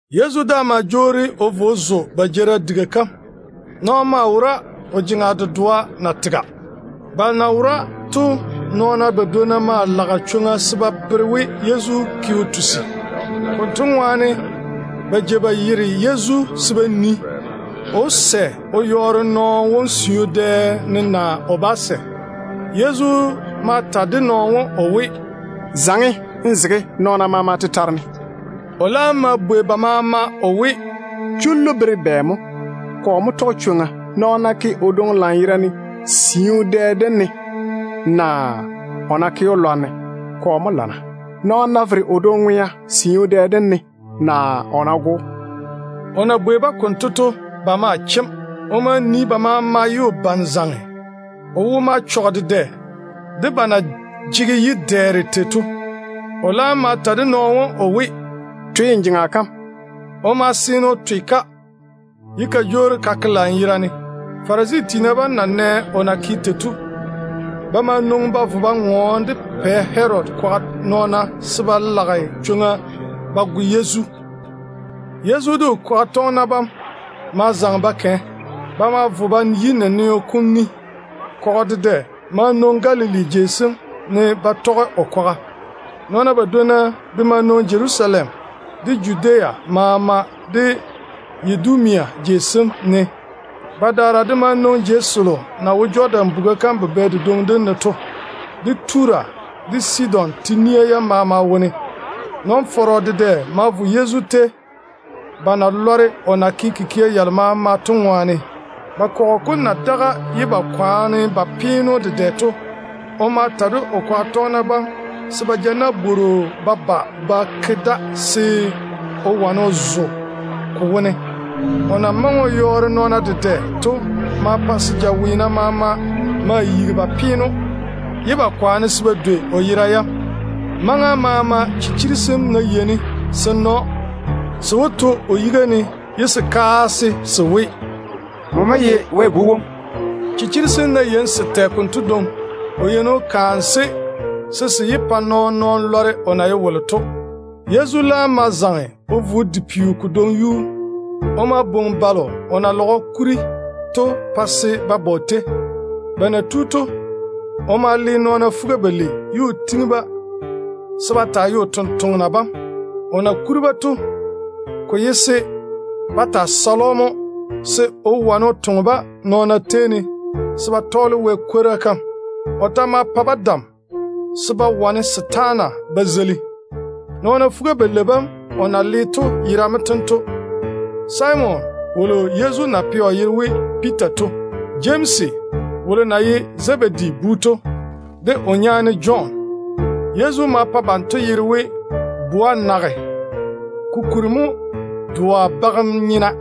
Yezu daa ma jwoori o vo o zo ba jeerim diga kam. Nɔɔno maa wora o jeŋa dedoa na tega. Nɔɔna balo na wora to badwonna maa lage chwoŋa se ba bere we Yezu ke o tusi. Konto ŋwaane ba jei ba yere Yezu se ba nii, o wó sɛ o yɔɔre nɔɔno wom siu dɛ ne naa o bá sɛ. Yezu ma ta de nɔɔno wom o we, “Zaŋe n zege nɔɔna maama tetare ne.” O laam ma bwei ba maama o we, “Dé chullu tem bere bɛ mo? Kɔ mo tɔge chwoŋa, nɔɔno ná ke o dwoŋi lanyerane siu dɛ dem ne, naa o ná ke‑o lwarem? Kɔ mo lamma, nɔɔno ná vere o dwoŋi ŋwea siu dɛ dem ne, naa o ná go‑o?” O na bwei-ba konto to, ba ma chem. O ma nii ba maama ye o bane zaŋe. O wo ma chɔge dedɛ de ba na jege yi-dɛɛre tei to. O laam ma ta de nɔɔno wom o we, “Twe n jeŋa kam.” O ma seene o twe-ka, ye ka jwoori ka ke lanyerane. Farisi tiina bam na nɛ o na ke tei to, ba ma nwoŋi ba vo ba ŋɔɔne de Pɛ Herodi kwaga nɔɔna se ba beeri chwoŋa ba go Yezu. Yezu de o kwaga tɔgena bam ma zaŋe ba kɛ. Ba ma vo ba yi naneo kom ni. Kɔgɔ dedɛ ma nwoŋi Galili de Judea jei sem maama ne ba tɔge o kwaga. Nɔɔna badwonna de ma nwoŋi Jerusalem, de Judea maama, de Yidumia jei sem ne. Badaara de ma nwoŋi jei selo na wo Jɔdan buga kam bubɛ dedwoŋi dem ne to, de Tura de Sidon nawuura yam maama wone. Nɔn-fɔrɔ dedɛ ma vo Yezu tei, ba na lɔre o na ke kikia yalo maama to ŋwaane. Ba kɔgɔ kom na daga ye ba kwaane ba peene‑o dedɛ to, o ma ta de o kwaga tɔgena bam se ba ja nabworo ba ba ba zege da se o wane o zo ko wo. O na maŋe o yɔɔre nɔɔna dedɛ to ma pa se jaweena maama ma yigi ba peene‑o, ye ba kwaane se ba dwei o yera yam. Maŋa maama chichiri sem ná yeini se na‑o, se wó to o yiga ne ye se kaase se we, “Nmo mo ye Wɛ Bu wom.” Chichiri sem ná yeini se tɛ konto dwoŋi, o yeini o kaane-se mo se se yé pa nɔɔn-nɔɔno lɔre o na ye wolo to. Yezu laam ma zaŋe o vo o di peo kodwoŋi yuu. O ma bwoŋi balo o na lage o kuri to pa se ba ba o tei. Ba na tu to, o ma le nɔɔna fuga-balei ye o tiŋi-ba se ba taa ye o totoŋa nakwa bam. O na kuri-ba to, ko ye se ba taa sale‑o mo, se o wane o toŋe-ba nɔɔna tei ne se ba tɔɔle Wɛ kwora kam. O ta ma pa-ba dam se ba wane setaana ba zeili. Nɔɔna fuga-balei bam o na le to yera mo tento: Simon wolo Yezu na pɛ o yere we Piita to. Jemsi wolo na ye Zebedi bu to, de o nyaane Jɔn. Yezu ma pa banto yere we Boanerega, ko kuri mo ‘Doa bagem nyena’.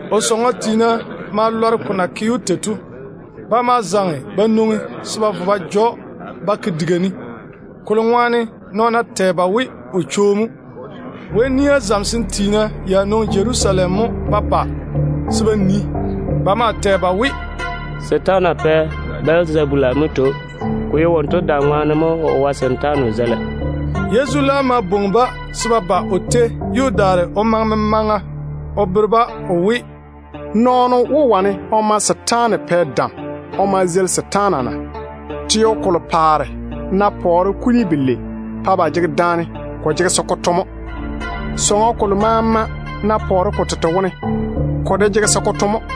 O sɔŋɔ tiina ma lɔre ko na ke‑o tei to. Ba ma zaŋe ba nwoŋi se ba vo ba ja‑o ba ke diga ne, kolo ŋwaane nɔɔna tɛ ba we o chwo mo. Wɛ nia zamesem tiina ya nwoŋi Jerusalem mo ba ba se ba nii. Ba maa tɛ ba we, “Setaana pɛ Bɛlzabula mo tei‑o. Ko ye wonto dam ŋwaane mo o wae setaana o zeila.” Yezu laam ma bwoŋi-ba se ba ba o tei ye o daare o maŋe memaŋa o bere-ba o we, “Nɔɔno wó wane o ma setaana pɛ dam o ma zeili setaana na? Teo kolo paare ná pɔɔre kuni belei pa ba jege daane, ko jege se ko to mo. Sɔŋɔ kolo maama ná pɔɔre ko tete wone, ko de jege se ko to mo.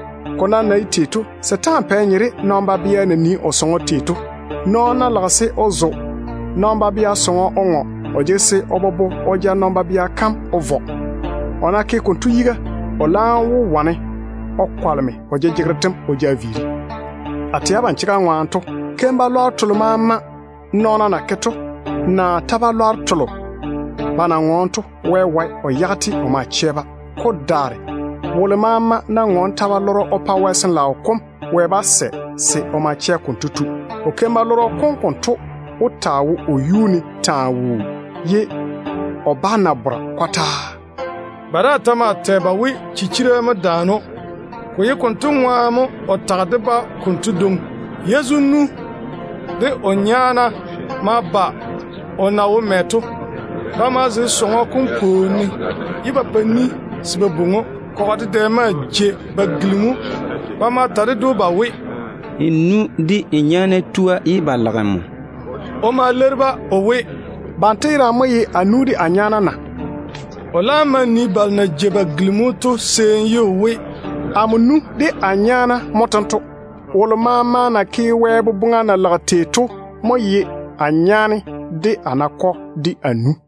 Ko nam na ye tei to, setaana pɛ nye de nɔn-babea na nii o sɔŋɔ tei to mo. Venvereno ná lage se o zo nɔn-babea sɔŋɔ o ŋɔ, o jege se o bobo o ja nɔn-babea kam mo o vɔ. O ná ke konto yiga, o laam wó wane o kwaleme o jejegero tem o ja viiri. A tɛ abam chega ŋwaane to, keim-balwaaro telo maama nɔɔna na ke to, naa ta-balwaaro telo ba na ŋɔɔne to, Wɛ wae o yage-te o ma chɛ-ba. Ko daare wolo maama nam ná ŋɔɔne o yaale Wɛ Sin-laao kom, Wɛ bá sɛ o ma chɛ konto tu. O keim-balɔrɔ kom konto wó taa wo o yuu ne mo taa wuu, ye o bere o bá na bora kɔtaa.” Ba daa ta maa tɛ ba we chichira mo daane‑o. Ko ye konto ŋwaane mo o tage de-ba konto dwoŋi. Yezu nu de o nyaana ma ba o na wo mɛ to. Ba ma vo ba zege sɔŋɔ kom pwooni ne, ye ba pa ni se ba bwoŋi‑o. Kɔgɔ dedɛ maa jei ba gilimi Yezu. Ba ma ta ded‑o ba we, “N nu de n nyaana tua, ye ba lage nmo.” O ma leiri-ba o we, “Banto yerane mo ye a nu de a nyaana na?” O laam ma nii balo na jei ba gilimi‑o to seeni ye o we, “Amo nu de a nyaana chekke mo tento. Wolo maama na ke Wɛ boboŋa na lage tei to mo ye a nyaane, de a nakɔ, de a nu.”